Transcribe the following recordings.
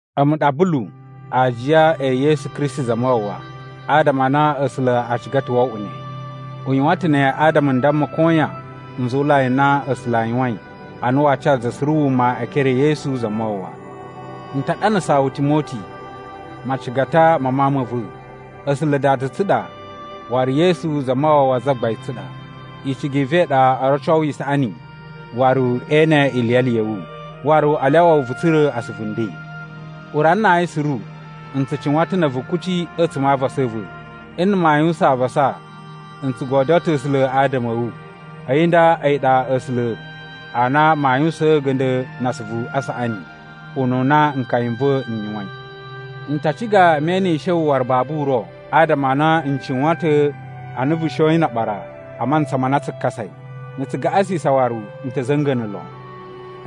A̱mu ɗa Bulu, aajiya e Yesu Kristi Zamawawa adama a na A̱sula̱ a ciga ta̱ wo oꞌwo ne. U yuwan ta̱ ne adama n damma koyan nzuwulai n na A̱sula̱ a yuwain a na waa ca za suru wuma e ekere e Yesu Zamawawa. N ta ɗanasaa wu Timoti, macigata ma mawun ma̱ va̱. A̱sula̱ Dada tsu ɗa waru Yesu Zamawawa Zagbain tsu ɗa. Icigi i va̱ i ɗa o roco wu isaꞌani waru e ene iliyali ya̱ wu. Waru a lyawa wu vu tsura̱ asuvu nden. Urana na ayin suru, n tsu cuwan ta̱ na̱ a̱vu kuci a̱tsuma̱ a avasa a̱ va̱. Nna̱ maa yuwusan avasa n tsu godyo ta̱ A̱sula̱ adama a̱ wu. A̱yi nda a̱yi ɗa A̱sula̱ a na maa yuwusaan a̱ga̱nda̱ na asuvu a saꞌani, ununa nkaya n va̱ n yuwain. N ta ciga me enishe wu waru babu uro, adama a na n cuwan ta̱ a na vu shoyin na aɓara a mantsa ma na tsu kasai. Na̱ tsu gaꞌasisan waru n ta̱ za̱nga̱na̱ lon.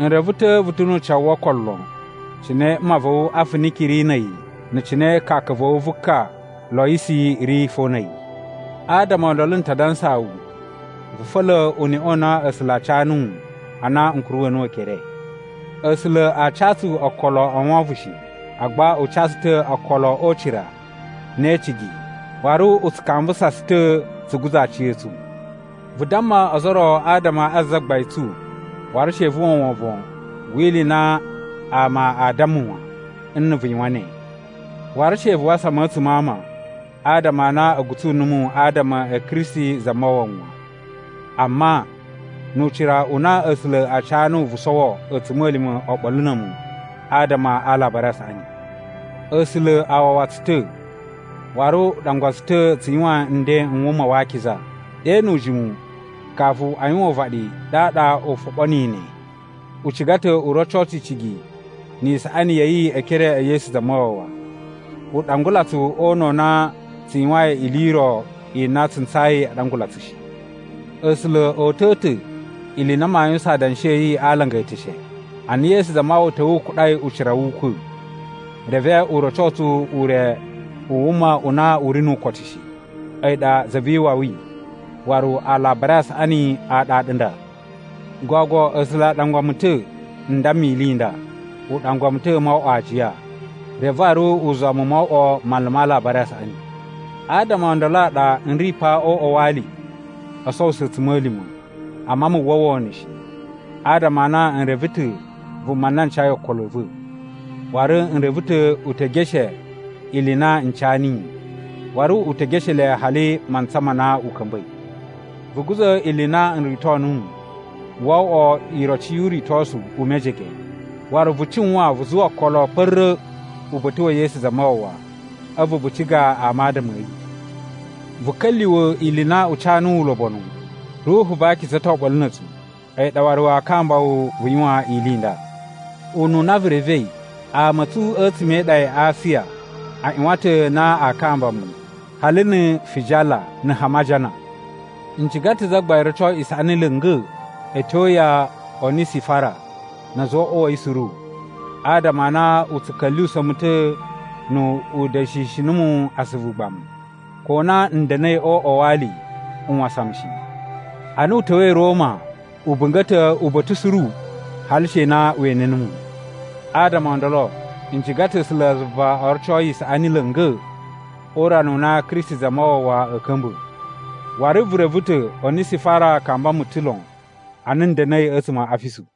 N reve ta̱ vu ta̱ nu ucawu wo okolo lon cine mma va̱ wu Afiniki ri na̱ a̱yi na̱ cine kaka va̱ wu vu ka Loyisi ri fo na̱ a̱yi. Adama o ndolo n ta dansaa wu vu fa̱la̱ uneꞌe u na A̱sula̱ a ca nuwu ana n kuruwa̱ nuwu ekere. A̱sula̱ a ca tsu okolo o wovon shi, agba u ca tsu ta̱ okolo o ucira, ne e icigi, waru u tsu kambusa tsu ta̱ tsu guza̱ aciya̱tsu. Vu damma ozo o ro adama a Zagbain tsu, waru she vu uwwa wovon wi ili i na ama aa damma wan, nna̱ vu yuwan ne. Waru she vu wasan mu a̱tsuma̱ a ama adama a na a̱ gutsu numu adama a̱ Kristi Zamawawa wan. Amma, nu ucira u na A̱sula̱ a ca nuwu vu sowo a̱tsuma̱lima̱ oɓolo na̱ a̱mu adama a Alabari a Saꞌani. A̱sula̱ a wawa tsu ta̱, waru u ɗangwa tsu ta̱ tsu yuwan nden n wuma wa akiza. Ɗe nu ujimu kafu a yuwan uvaɗi ɗaɗa u foɓo niyi ne. U ciga ta̱ u roco tsu icigi ni isaꞌani ya̱ yi e ekere e Yesu Zamawawa. U ɗangula tsu o una̱ u na tsu yuwain ili i ro i na tsu ntsayi a ɗangula tsu shi. A̱sula̱ o uta̱a̱ ta̱ ili i na maa yuwusan adanshi a̱ yi a alanga e eteshe, ana Yesu Zamawawa ta̱wa̱ u kuɗai ucira wu ukwa̱, reve u roco tsu ure u wuma u na u ri nu ukotu shi. A̱yi ɗa Za vi Iwawi waru Alabari a Saꞌani a ɗaɗa nda. Gogo A̱sula̱ a ɗangwa mu ta̱ n damma ili i nda. U ɗangwa mu ta̱ mo oꞌwo aajiya. Reve waru u zuwa mu mo oꞌwo manlu ma Alabari a Saꞌani. Adama o ndolo a ɗa n ri pa o uꞌwa wa ali o sowuso a̱tsuma̱lima̱. Amma mu uwwa wono shi, adama a na n reve ta̱ vuma na n cayi okolo a̱ va̱, waru n reve ta̱ u te geshe ili i na n ca niyi, waru u te geshe le hali mantsa ma na u ka̱mba̱i. Vu guza̱ ili i na n rito nuwu wo oꞌwo iroci yu uritosu u mejege. Waru vu cuwan vu zuwa okolo kpa̱ra̱ uba̱ta̱ wa̱ Yesu Zamawawa, a̱vu vu ciga ama adama a̱ yi. Vu ka̱lyuwa̱ ili i na u ca nuwu ulobonu. Ruhu va Akiza to oɓolo na̱ a̱tsu, a̱yi ɗa waru waa kamba wu vu yuwan ili i nda. Ununa vu revei, ama a̱ tsu a̱tsuma̱ e iɗa ya Asiya a ꞌyuwan ta̱ na aa kamba mu, hali na̱ Fijala na̱ Hamajana. N ciga ta̱ Zagbain roco isaꞌani la̱nga̱ a̱ tyo ya Onisifara na̱ a̱za̱ o uꞌwa wa̱ yi suru adama a na u tsu ka̱lyuwusa̱ mu ta̱ nu u da̱shishi numu asuvu ugbamu. Ko na n da̱na̱i o uꞌwa wa ali u wasan mu shi. Ana u ta̱wa̱i Roma, u bunga̱ ta̱ uba̱ta̱ suru hali she na we ene numu. Adama o ndolo, n ciga ta̱ A̱sulazuva o roco yi isaꞌani la̱nga̱ o urana u na Kristi Zamawawa a̱a̱ ka̱mba̱. Waru vu reve ta̱ Onisifara kamba mu ta̱ lon ana n da̱na̱i a̱tsuma̱ a Afisu.